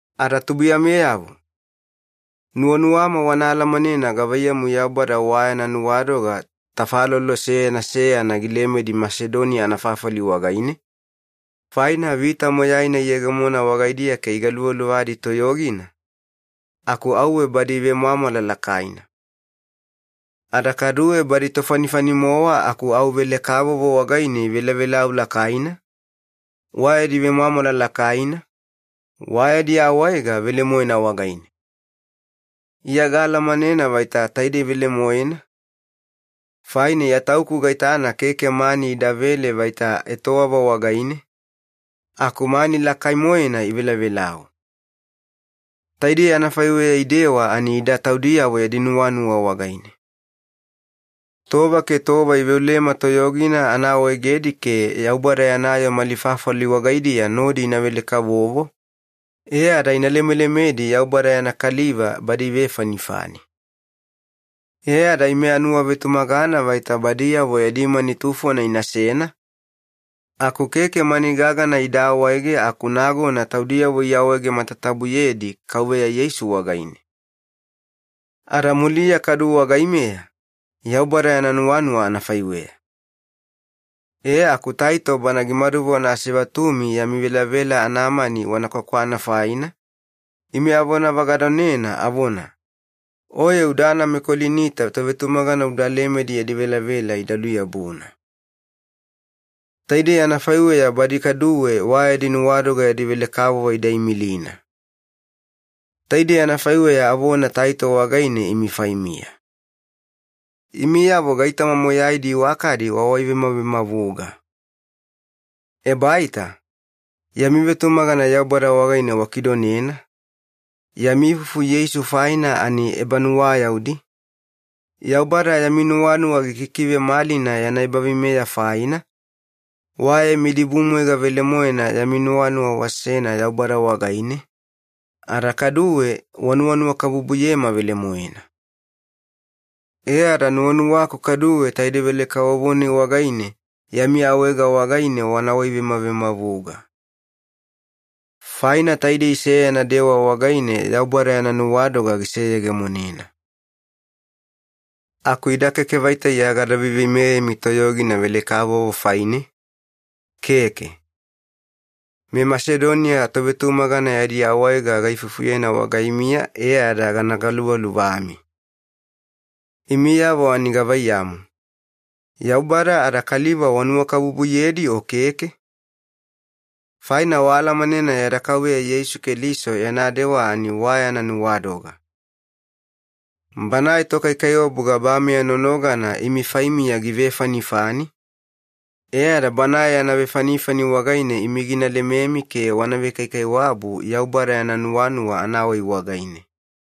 Ada tubuiyameyavo, nuwanuwama wana alamanena gavaiyamu Yaubada wa yana nuwadoga tafalolo seyana seyana gilemedi Masedoniya anafafali wagaine, Faina vita moyaina iyegemona wagaidiya ke igaluvaluvadi toyogina, aku auwe badi ivemwamwala lakaina. Ada kaduwe badi tofanifani-mowa aku au velekavovo wagaine ivelavelau lakaina, wa yadi vemwamwala lakaina, wa yadi awaega velemoena wagaine. Iya gaalamanena vaita taidei velemoena, faina Iya tauku gaitana keke mani idavele vaita etowava wagaine, aku mani lakai-moena ivelavelau. Taidei anafaiweya idewa ani ida taudiyavo yadi nuwanuwa wagaine. Tova ke tova iveolema toyogina ana awaegedi ke Yaubada yana yoo mali fafali wagaidiya nodi ina velekavovo, e ada ina lemelemedi Yaubada yana kaliva badi ivefanifani. E ada ime anuwavetumagana vaita badiyavo yadi mani tufona inasena, aku keke mani gagana ida awaege aku nagona taudiyavo iawaege matatabuyedi Kauveya Yeisu wagaine. Ada muliya kaduwe wagaimeya, Yaubada yana nuwanuwa anafaiweya. E aku Taito bana gimaduvona asevatumi yami velavela anamani wana kwakwana faina, ime avonavagadonena avona, “Oye udana meKolinita tovetumagana uda lemedi yadi velavela ida luyabuna. Taidei anafaiweya badi kaduwe wa yadi nuwadoga yadi velekavovo ida imilina.” Taidei anafaiweya avona Taito wagaine imi faimiya. Imiyavo gaitoma moyaidi iwakadi wawaivemavemavuga. Ebaita, yami vetumagana Yaubada wagaine wakidonena, yami ifufu Yeisu faina ani ebanuwayaudi, Yaubada yami nuwanuwa gikikivemalina yana ebaveimeya faina, wa yami dibumwaiga velemoena yami nuwanuwa wasena Yaubada wagaine, ada kaduwe wanuwanuwakabubuyema velemoena. E ada nuwanuwaku kaduwe taidei velekavovo-nai wagaine yami awaega wagaine wana waivemavemavuga. Faina taidei seyana dewa wagaine Yaubada yana nuwadoga giseyegemonena. Aku ida keke vaita Iya gada veimeyemi toyogina velekavovo faine, keke. MeMasedonia tovetumagana yadi awaega gaifufuyena wagaimiya e ada gana galuvaluvami. Imiyavo ani gavaiyamu, Yaubada ada kaliva wanuwakabubuyedi o keke? Faina waalamanena yada Kauveya Yeisu Keliso yana dewa ani wa yana nuwadoga. Banae Tokaikaiwabu gabameya nonogana imi faimiya givefanifani, e ada Banae yana vefanifani wagaine imi gina lememi ke wana vekaikaiwabu Yaubada yana nuwanuwa anawai wagaine.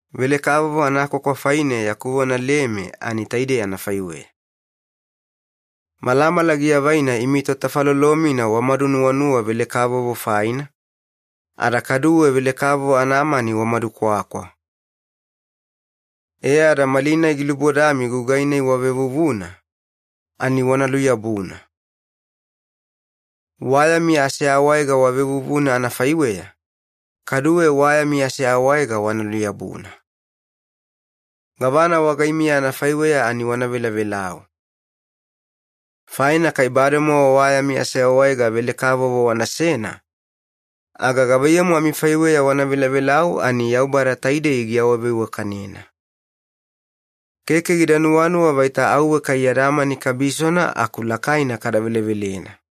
Velekavovo anakwakwa faine yaku vona lema ani taidei anafaiweya. Malamala giavaina imi totafalolo-mina wamadunuwanuwa velekavovo faina, ada kaduwe velekavovo anamani wamadukwakwa. E ada malinai gilubodami gugai-nai wavevuvuna, ani wana luyabuna. Wa yami aseawaega wavevuvuna anafaiweya, kaduwe wa yami aseawaega wana luyabuna. Gavana wagaimiya anafaiweya ani wana velavelau. Faina kai bademowa wa yami aseawaega velekavovo wanasena, aga gavaiyamu amifaiweya wana velavelau ani Yaubada taidei giawaveiwakanena. Keke gida nuwanuwa vaita auwe kai yada mani kabisona aku lakaina kada velevelena.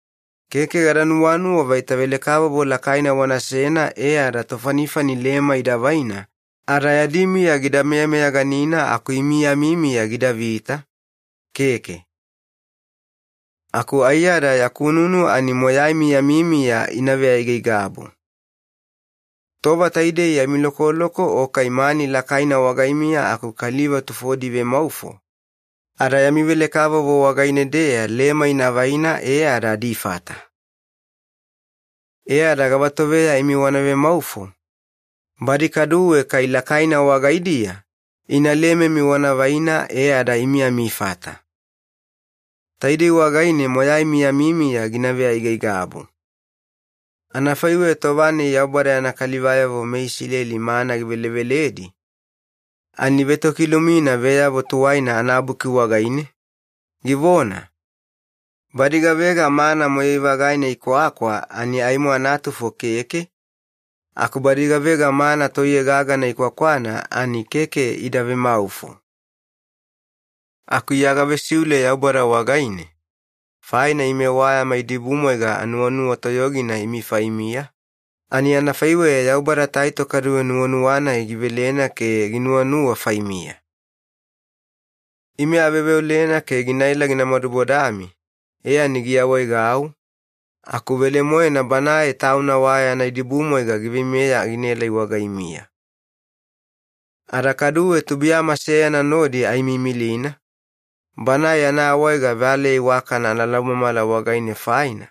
Keke gada nuwanuwa vaita velekavovo lakaina wanasena e ada tofanifani lema ida vaina ada yadi miya gida meyameyaganina aku imi yami miya gidavita, keke. Aku aiyada yaku nunu ani moyaimi yami miya ina veaigaigabu. Tova taidei yami lokoloko o kai mani lakaina wagaimiya aku kaliva tufodi ivemaufo, ada yami velekavovo wagaine-deya lema ina vaina e ada adifata. E ada gavatoveya imi wana vemaufo, badi kaduwe kai lakaina wagaidiya ina lememi wana vaina e ada imi amifata. Taidei wagaine moyaimi yami miya gina veaigaigabu. Anafaiweya tova-nai Yaubada yana kalivayavo meIsileli mana giveleveledi, ani ivetokilumina Veyavo Tuwaina anaBuki wagaine, givona, “Badi gavega mana moyai-vagaina ikwakwa ani aimo anatufo keke, aku badi gavega mana toiye gagana ikwakwana ani keke ida vemaufo.” Aku Iya gavesiule Yaubada wagaine, faina ime wa yama idibumwaiga anuwanuwa toyogina imi faimiya, ani anafaiweya Yaubada Taito kaduwe nuwanuwa-nai givelena ke ginuwanuwa faimiya. Ime aveolena ke ginaela gina madubodami e ani giawaegau, aku velemoena banae tauna wa yana dibumwaiga giveimeya ginaelai wagaimiya. Ada kaduwe tubuiyama seyana nodi aimiimilina, banae yana awaega valeya iwakana analaumamala wagaine faina,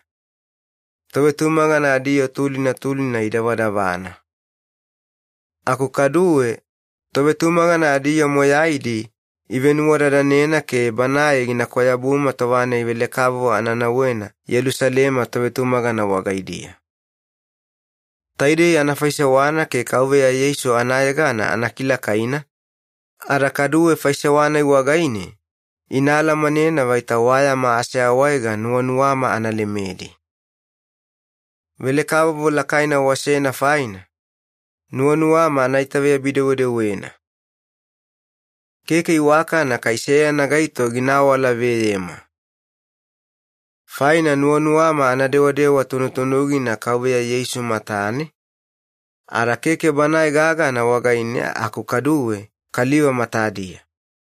tovetumagana adiyoo tulina tulina idavadavana. Aku kaduwe, tovetumagana adiyoo moyaidi ivenuwadadanena ke banae gina kwayabuma tova-nai velekavovo ana nauwena Yelusalema tovetumagana wagaidiya. Taidei ana faisewana ke Kauveya Yeisu anayegana ana kilakaina, ada kaduwe faisewa-nai wagaine ina alamanena vaita wa yama aseawaega nuwanuwama ana lemedi. Velekavovo lakaina wasena faina, nuwanuwama ana itaveyabi-dewedewena. Keke iwakana kai seyana gaito gina awalaveyema. Faina nuwanuwama ana dewadewa tunutunugina Kauveya Yeisu matane, ada keke Banae gagana wagaine aku kaduwe kaliva matadiya.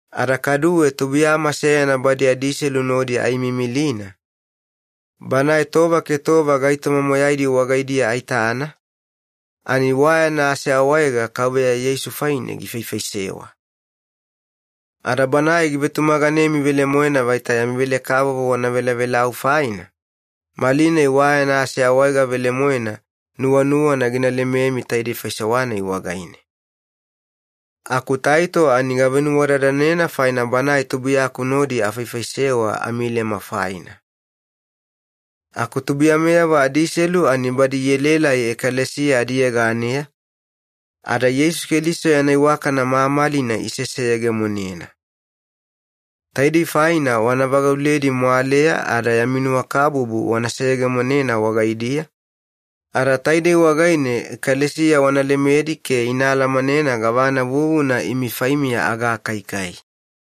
Ada kaduwe tubuiyama seyana badi adiselu nodi aimiimilina, banae tova ke tova gaitoma moyaidi wagaidiya aitana ani wa yana aseawaega Kauveya Yeisu faine gifaifaisewa. Ada banae givetumaganemi velemoena vaita yami velekavovo wana velavelau faina, malinai wa yana aseawega velemoena nuwanuwana gina lememi taidei faisewa-nai wagaine. Aku Taito ani gavenuwadadanena faina banae tubuiyaku nodi afaifaisewa amilema faina. Aku tubuiyameyavo adiselu ani badi ielaelai ekalesiya adiyeganeya, ada Yeisu Keliso yana iwakana mamalina iseseyegemonena. Taidei faina wana vagauledi mwaleya ada yami nuwakabubu wana seyegemonena wagaidiya, ada taidei wagaine ekalesiya wana lemedi ke ina alamanena gavana vuvuna imi faimiya agakaikai.